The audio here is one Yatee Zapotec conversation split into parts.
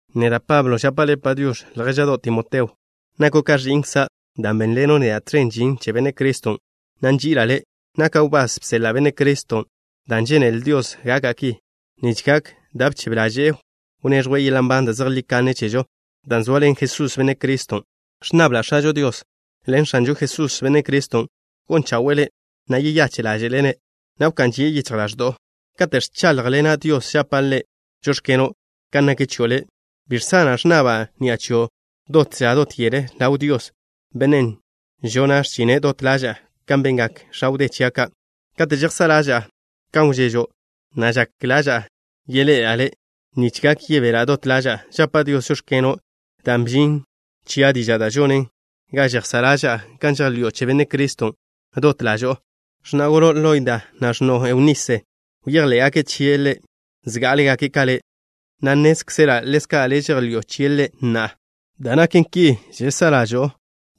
Neda', Pablo, žapa' le' “Padiox̱” ljéža'do' Timoteo. Nako' ka ẕi'nkza' dan' bénḻeno' neda' tẕen žin che Benne' Criston', na' nži'ila' le'. Naka' wbás bseḻa' Benne' Criston' dan' žénele Dios gaka' ki, nich gak da' bchebe ḻaže'e, wneẕjwe' yeḻa' nban da' zejlí kanne chežo, dan' zoaḻen Jesús, Benne' Criston'. Ẕnnabla' X̱ažo Dios ḻen X̱anžo Jesús, Benne' Criston', gon chawe'e le', na' yeyache' ḻáže'le' le', na' wká'n žie' yichj ḻaẕdo'o. Kate' ẕcháḻjḻena' Dios žapa' Ḻe' “žóx̱keno'” kan nak chio' le'. Bi žsana' ẕnnaba' ni'a chio' dot ža dot yel, ḻaw Dios, Bennen' žona' x̱chine' dot ḻaža'a kan bengak x̱a wdé chia' ka'. Kate' žejsá' ḻaža'a kan wžežo', na' žak ḻaža'a yeḻe'ela' le', nich gak yebela' dot ḻaža'a. Žapa' Dios: “Žóx̱keno'” dan' bžin chia' diža' da' žonen ga žejsá' ḻaža'a kan žejḻi'o che Benne' Criston' dot ḻažo'o. X̱na' golo' Loida, na' x̱no'o Eunise, bejḻé'gake' chie' Ḻe' zgá'alegake' ka le', na' nnézkzela' ḻezka' le' žejḻi'o chie' Ḻe' na'a. Dan' naken ki, žsa'a ḻažo'o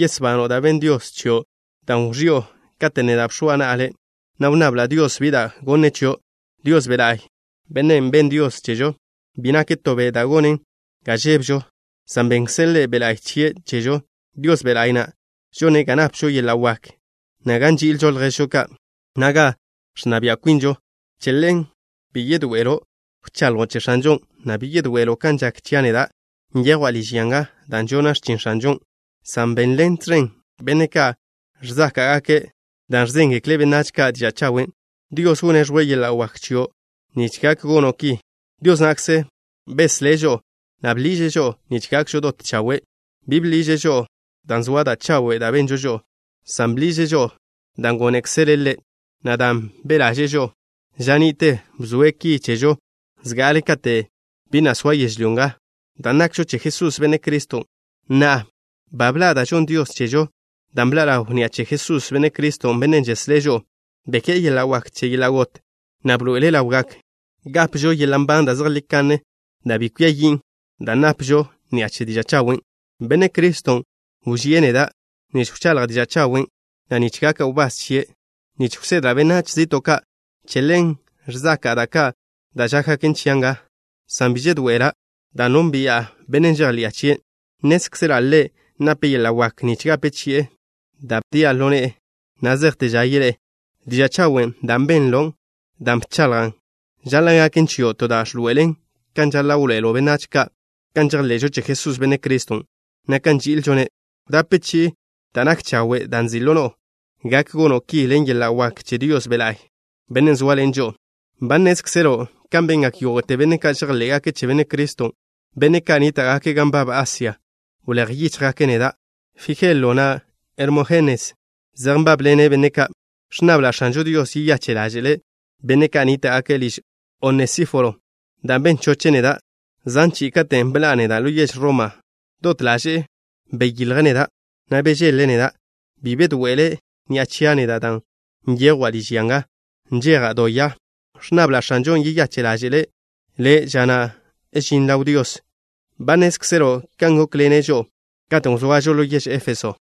yesbano' da' benn Dios chio', dan' wẕi'o katen' neda' bx̱oa na'a le', na' wnnabla' Dios bi da' gonne' chio'. Dios Be' La'y, Bennen' benn Dios chežo, bi nake' to be' da' gonen ga žébežo, san bennkze' Ḻe' Be' La'y chie' chežo. Dios Be' La'y na' žone' ga napžo yeḻa' wak, na' ga nži'ilžo lježžo ka', na' ga ẕnna bia' kwinžo. Che ḻen, bi yedoe'elo' wchaḻjo' che X̱anžon', na' bi yedoe'elo' kan žak chia' neda', nyejwa' liž ya nga dan' žona' x̱chin X̱anžon', san benḻen tẕen benne' ka' ẕzáka'gake' dan' ẕzéngekle' benách ka' diža' chawen'. Dios wneẕjwe' yeḻa' wak chio' nich gak gono' ki. Dios na'kze beslé' žo'o, na' bḻiže' žo'o nich gakžo dot chawe'. Bi bḻiže' žo'o dan' zoa da' chawe' da' benžo žo'o, san bḻiže' žo'o dan' gónekzele' Ḻe', na' dan' be' ḻaže'e žo'o. Ža ni'te bzoe' ki chežo zga'ale kate' bi na' soa yežlyó nga, dan' nakžo che Jesús, Benne' Criston'. Na'a, ba bḻa' dan' žonn Dios chežo, dan' bḻa' ḻaw ni'a che Jesús, Benne' Criston', Bennen' žeslé' žo'o. Beké'e yeḻa' wak che yeḻa' got, na' bḻoe'ele' ḻaw gak gápežo yeḻa' nban da' zejlí kanne, da' bi kwia yin', dan' nápežo ni'a che diža' chawen'. Benne' Criston' wžíe' neda' nich wchaḻja' diža' chawen', na' nich gaka' wbás chie' nich wsedla' benách zi'to' ka'. Che ḻen ẕzaka'a da' ka' da' žákgaken chia' nga, san bi žedoe'ela', dan' nónbi'a Bennen' žejḻi'a chie'. Nnézkzela' Ḻe' nape' yeḻa' wak nich gape chi'e da' bdia' ḻo ne'e na' zejte ža yeḻé'e. Diža' chawen' dan' benlon', dan' bchaḻjan', žaḻa' gaken chio' to da' ẕḻoe'elen kan žaḻa' wḻoe'elo' benách ka' kan žejḻe'žo che Jesús, Benne' Criston', na' kan nži'ilžo-ne'. Wdape chi'i da' nak chawe', dan' nzi' ḻo no'o. Gak gono' ki ḻen yeḻa' wak che Dios Be' La'y, Bennen' zóaḻene' žo'o. Ba nnézkzelo' kan bengak yógo'te benne' ka' žejḻé'gake' che Benne' Criston', benne' ka' nníta'gake' gan nbab Asia, wléj yíchjgake' neda'. Fijelo, na' Hermójenes zej nbábḻene' benne' ka'. Ẕnnabla' X̱anžo Dios yeyache' ḻáže'le' benne' ka' nníta'gake' liž Onesíforo, dan' ben choche' neda' zan chi'i. Katen' bḻa'a neda' ḻo yež Roma, dot ḻaže'e beyilje' neda', na' bežeḻ-le' neda'. Bi bedoe'ele' ni'a chia' neda' dan' nyejwa' liž ya nga, nžeja' do ya. Ẕnnabla' X̱anžon' yeyache' ḻáže'le' ḻe' ža na' žine' ḻaw Dios. Ba nnézkzelo' kan gókḻene' žo'o, katen' wzoažo ḻo yež Éfeso.